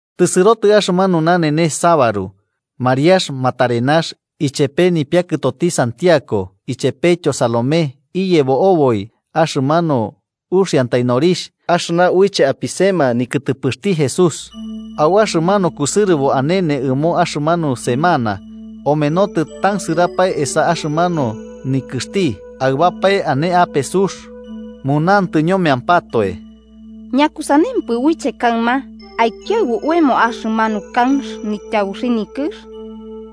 Tɨsɨrotɨ axɨmanu nanenes sabaru, Mariax Magdalena ichepe nipiakɨtoti Santiago ichepetyo Salomé iyebo oboi axɨmanu uxiantai norixh axɨna uiche apisema nikɨtɨpɨxti Jesús. Au axɨmanu kusɨrɨbo nanenes ɨmo axɨmanu semana omenotɨ tansɨrapae esa axɨmanu nikɨxti, aɨbapae ane ape sux, munantɨ ñomeampatoe: –¿Ñakusanempɨ uiche kaɨma aikiaɨbu oemo axɨmanu kanx nityabuxi nikɨx?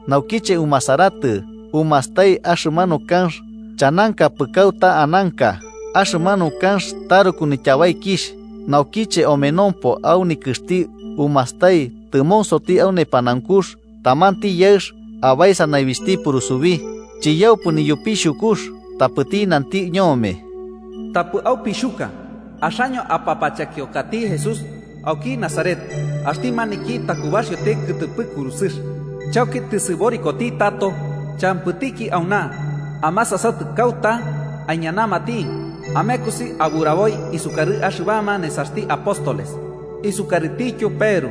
Naukiche, umasaratɨ, umastai axɨmanu kanx chanankapɨ kauta ananka. Axɨmanu kanx taruku nityabaikixh. Naukiche omenompo au nikɨxti umastai, tɨmonsoti au nepanaunkux, tamanti yaɨx abaesa naibixhti purusubi. Chiyaupɨ niyupixhukux, tapɨti nanti ñome: –Tapɨ aupixhuka. Axaño apapachekiokati Jesús auki Nazaret, axti maniki takubaxioti kɨtɨpɨ kurusɨx. Chauki tɨsɨborikoti tato. Champɨtiki auna. Amasasatɨ kauta aiñanamati. Amekosi aburaboi isukarɨ axɨbama nesaxti apóstoles isukarɨtityo Peru: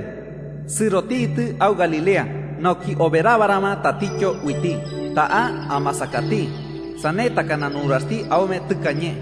‘Sɨrotitɨ au Galilea nauki oberabarama tatityo uiti. Ta'a amasakati, sane takana nuraxti aume tɨkañe.’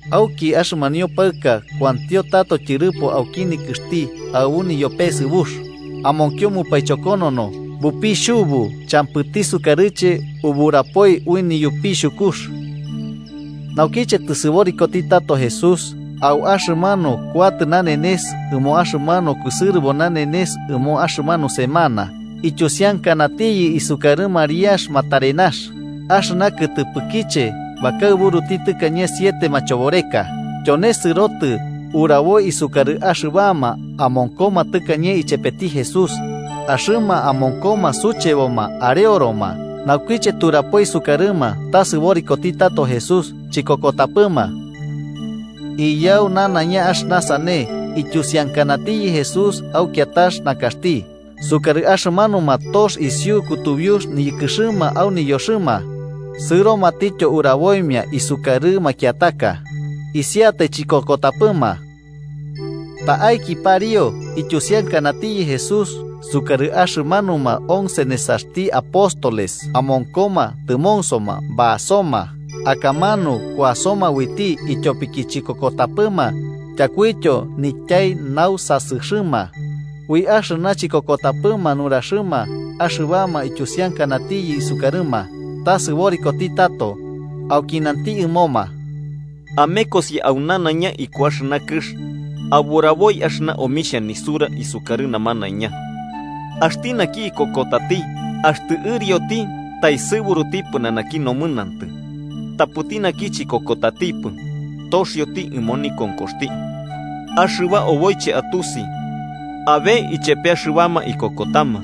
Auki axɨmanio paɨka kuantio tato tyɨrɨpo auki nikɨxti aɨbu niyopesɨbux, amonkio mupaichokonono, bupixhubu. Champɨti sukarɨche uburapoi, ui niyopixhukux. Naukiche tɨsɨborikoti tato Jesús au axɨmanu kuatɨ nanenes ɨmo axɨmanu kusɨrɨbo nanenes ɨmo axɨmanu semana, ityusiankanatiyɨ isukarɨ Mariax Magdalena, axɨna kɨtɨpɨkiche bakaɨburuti tɨkañe siete machoboreka. Tyone sɨrotɨ uraboi isukarɨ axɨbama amonkoma tɨkañe ichepeti Jesús, axɨma amonkoma sucheboma areoroma. Naukiche turapoi isukarɨma ta sɨborikoti tato Jesús, chikokotapɨma. Iyau nanaiña axɨna sane, ityusiankanatiyɨ Jesús au kiatax nakaxti isukarɨ axɨmanuma tox isiu kutubiux niyɨkɨxɨma au niyoxɨma. Sɨromatityo uraboimia isukarɨ makiataka. Isiatai chikokotapɨma. Ta'aiki pariu ityusiankanatiyɨ Jesús isukarɨ axɨmanuma once nesaxti apóstoles, amonkoma tɨmonsoma basoma. Akamanu kuasoma uiti ityopiki chikokotapɨma tyakuityo nityai nausasɨxɨma, ui axɨna chikokotapɨma nuraxɨma axɨbama ityusiankanatiyɨ isukarɨma, ta sɨborikoti tato. Auki nanti ɨmoma: “Amekosi au nanaiña iku axɨna kɨx aburaboi axɨna omixhia nisura isukarɨ namanaiña. Axti naki ikokotati axtɨ ɨrioti, taesɨburuti pɨnanaki nomɨnantɨ. Tapɨti naki chikokotatipɨ, toxioti ɨmo nikonkoxti. Axɨba oboiche atusi abe ichepe axɨbama ikokotama: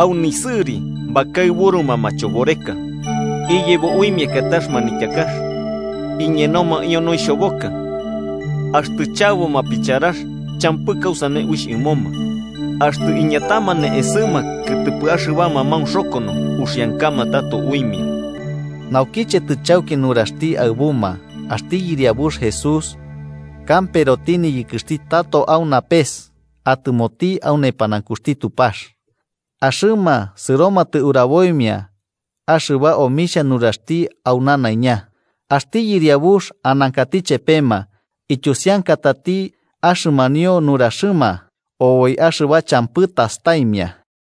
au nisɨri bakaɨburuma machoboreka. Iyebo uimia kiatax manityakax. Iñenomaio noixhoboka. Axtɨ chaboma picharax, champɨ kausane uixh ɨmoma. Axtɨ iñatama ne'esɨma kɨtɨpɨ axɨbama maunxokono, uxiankama tato uimia.” Naukiche tɨchauki nuraxti aɨbuma, axti Yɨriabux Jesús kamperoti niyɨkɨxti tato au napes atɨmoti au nepanaunkuxti Tupax. Axɨma sɨromatɨ uraboimia axɨba omixhia nuraxti au nanaiña. Axti Yɨriabux anankati chepema, ityusiankatati axɨmanio nuraxɨma oboi axɨba champɨ tastaimia.]